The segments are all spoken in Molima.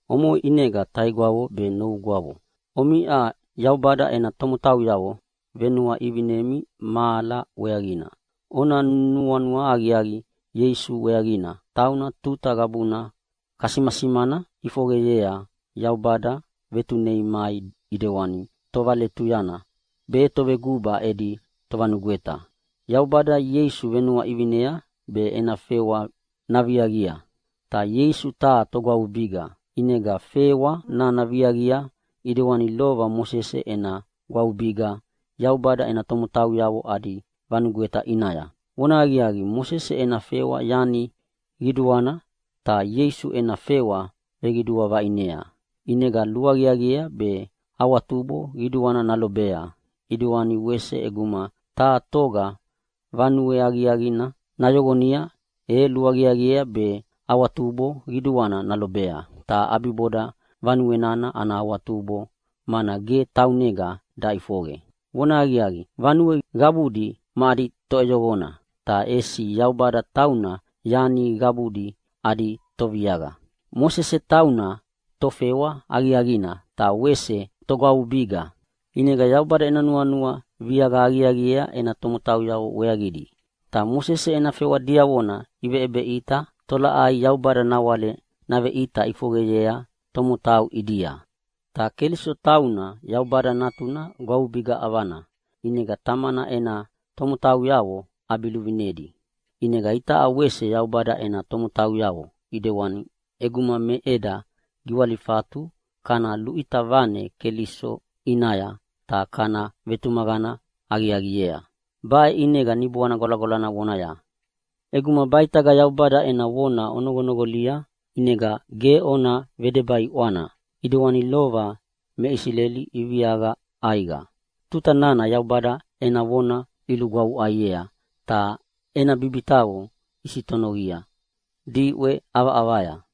Omoʼe ʼinega taigwavo be novugwavo, omiʼa Yaubada ena tomotauyavo venuaʼivinemi mahala weaqina. Ona nuanua aqiaqi Ieisu weaqina, tauna tuta qabuna kasimasimana ʼifoqeyea Yaubada vetunei mai ʼidewana tovaletuyana be toveguba edi tovanugweta. Yaubada Ieisu venuaʼivinea be ena fewa naviaqia. Ta Ieisu taha togwavubiga, ʼinega fewa nana viaqia ʼidewani lova Mosese ena gwavubiga Yaubada ena tomotauyavo adi vanugweta ʼinaya. Vonahaqiaqi, Mosese ena fewa yani qiduana, ta Ieisu ena fewa veqidua vaʼinea, ʼinega luaqiaqiea be awatubo qiduana nalobea. ʼIdewani wese ʼeguma taha toga vanue aqiaqina nayoqonia e luaqiaqiea be awatubo qiduana nalobea, ta ʼabiboda vanue nana ana awatubo mana ge taunega daʼifoqe. Vonahaqiaqi, vanue qabudi ma adi toʼeyoqona, ta ʼesi Yaubada tauna yani qabudi adi Toviaqa. Mosese tauna tofewa aqiaqina ta wese togwavubiga. ʼInega Yaubada ena nuanua viaqa aqiaqiea ena tomotauyavo weaqidi. Ta Mosese ena fewa diavona iveʼebeʼita tolaʼai Yaubada nawale naveʼita ʼifoqeyea tomotau ʼidia. Ta Keliso tauna Yaubada Natuna gwavubiga ʼavana, ʼinega Tamana ena tomotauyavo ʼabiluvinedi. ʼInega itaʼa wese Yaubada ena tomotauyavo ʼidewana ʼeguma me eda giwalifatu kana luʼita vane Keliso ʼinaya ta kana vetumaqana aqiaqiea. Baʼe ʼinega Niboana Gwalagwalana vonaya, “ʼEguma baʼitaga Yaubada ena vona onoqonoqolia ʼinega ge ona vedeba ʼiʼwana ʼidewani lova me Isileli iviaqa ʼaiqa tuta nana Yaubada ena vona ilugwavuʼaiea ta ena bibitaqo isitonovia diʼwe ʼavaʼavaya.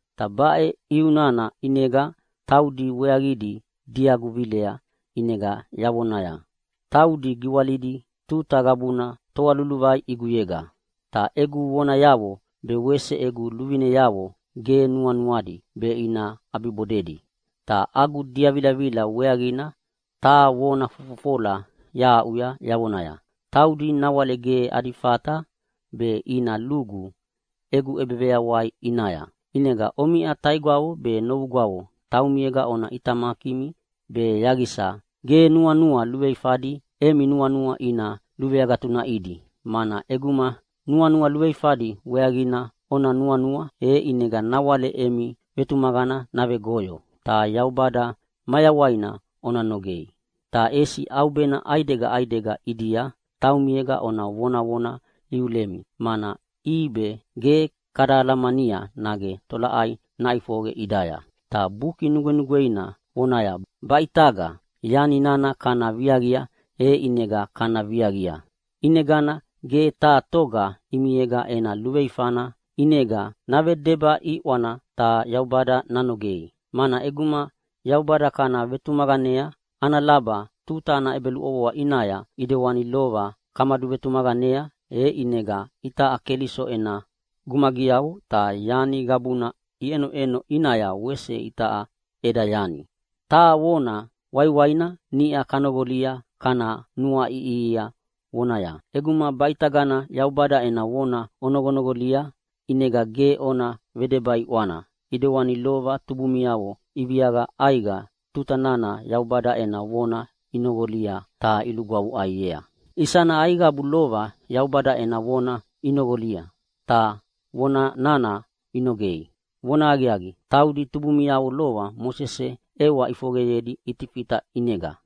Ta baʼe ʼiu nana ʼinega taudi weaqidi diagu vilea, ʼinega yavonaya, ‘Taudi giwalidi tuta qabuna toa luluvai ʼiguyega. Ta egu vonayavo be wese egu luvineavo ge nuanuadi be ina ʼabibodedi.’ Ta agu diavilavila weaqina taha vona fofofola yahaʼuya yavonaya, ‘Taudi nawale ge adi fata be ina lugu egu ʼebeveyawai ʼinaya.’” ʼInega omiʼa taigwavo be novugwavo taumiega ona ʼitamakimi be yaqisa ge nuanua luveifadi emi nuanua ina luveagatunaʼidi, mana ʼeguma nuanua luveifadi weaqina ona nuanua, e ʼinega nawale emi vetumaqana navegoyo ta Yaubada mayawaina ona nogei. Ta ʼesi ʼaubena ʼaidega ʼaidega ʼidia taumiega ona vonavona iulemi, mana ʼibe ge kada alamania nage tolaʼai naʼifoqe ʼidaya. Ta Buki Nugwenugweina vonaya “Baʼitaga” yani nana kana viaqia, e ʼinega kana viaqia! ʼInegana ge taha toga ʼimiega ena luveifana ʼinega navedeba ʼiʼwana ta Yaubada nanogei. Mana ʼeguma Yaubada kana vetumaqanea ana laba tuta ena ʼebeluʼovoa ʼinaya ʼedewani lova kamaduvetumaqanea, e ʼinega itaʼa Keliso ena gumagiavo ta yani qabuna iʼenoʼeno ʼinaya wese itaʼa eda yani. Taha vona waiwaina niʼa kanoqolia kana nuaiʼihia vonaya, “ʼEguma baʼitagana Yaubada ena vona onoqonoqolia, ʼinega ge ona vedeba ʼiʼwana ʼidewani lova tubumiavo iviaqa ʼaiqa tuta nana Yaubada ena vona inoqolia ta ilugwavuʼaiea.” Isana aiqabu lova Yaubada ena vona inoqolia, ta vona nana inogea? Vonahaqiaqi, taudi tubumiavo lova Mosese ʼewa ʼifoqeyedi Itifita ʼinega.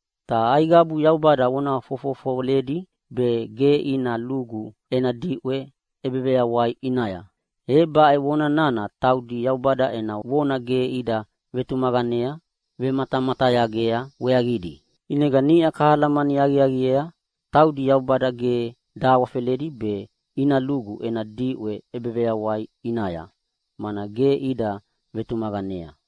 Ta aiqabu Yaubada vona fofofoledi be ge ina lugu ena diʼwe ʼebeveyawai ʼinaya? E baʼe vona nana taudi Yaubada ena vona ge ida vematamatayagea weaqidi. ʼInega niʼa kahalamani aqiaqiea taudi Yaubada ge dahawafeledi be ina lugu ena diʼwe ʼebeveyawai ʼinaya, mana ge ida vetumaqanea.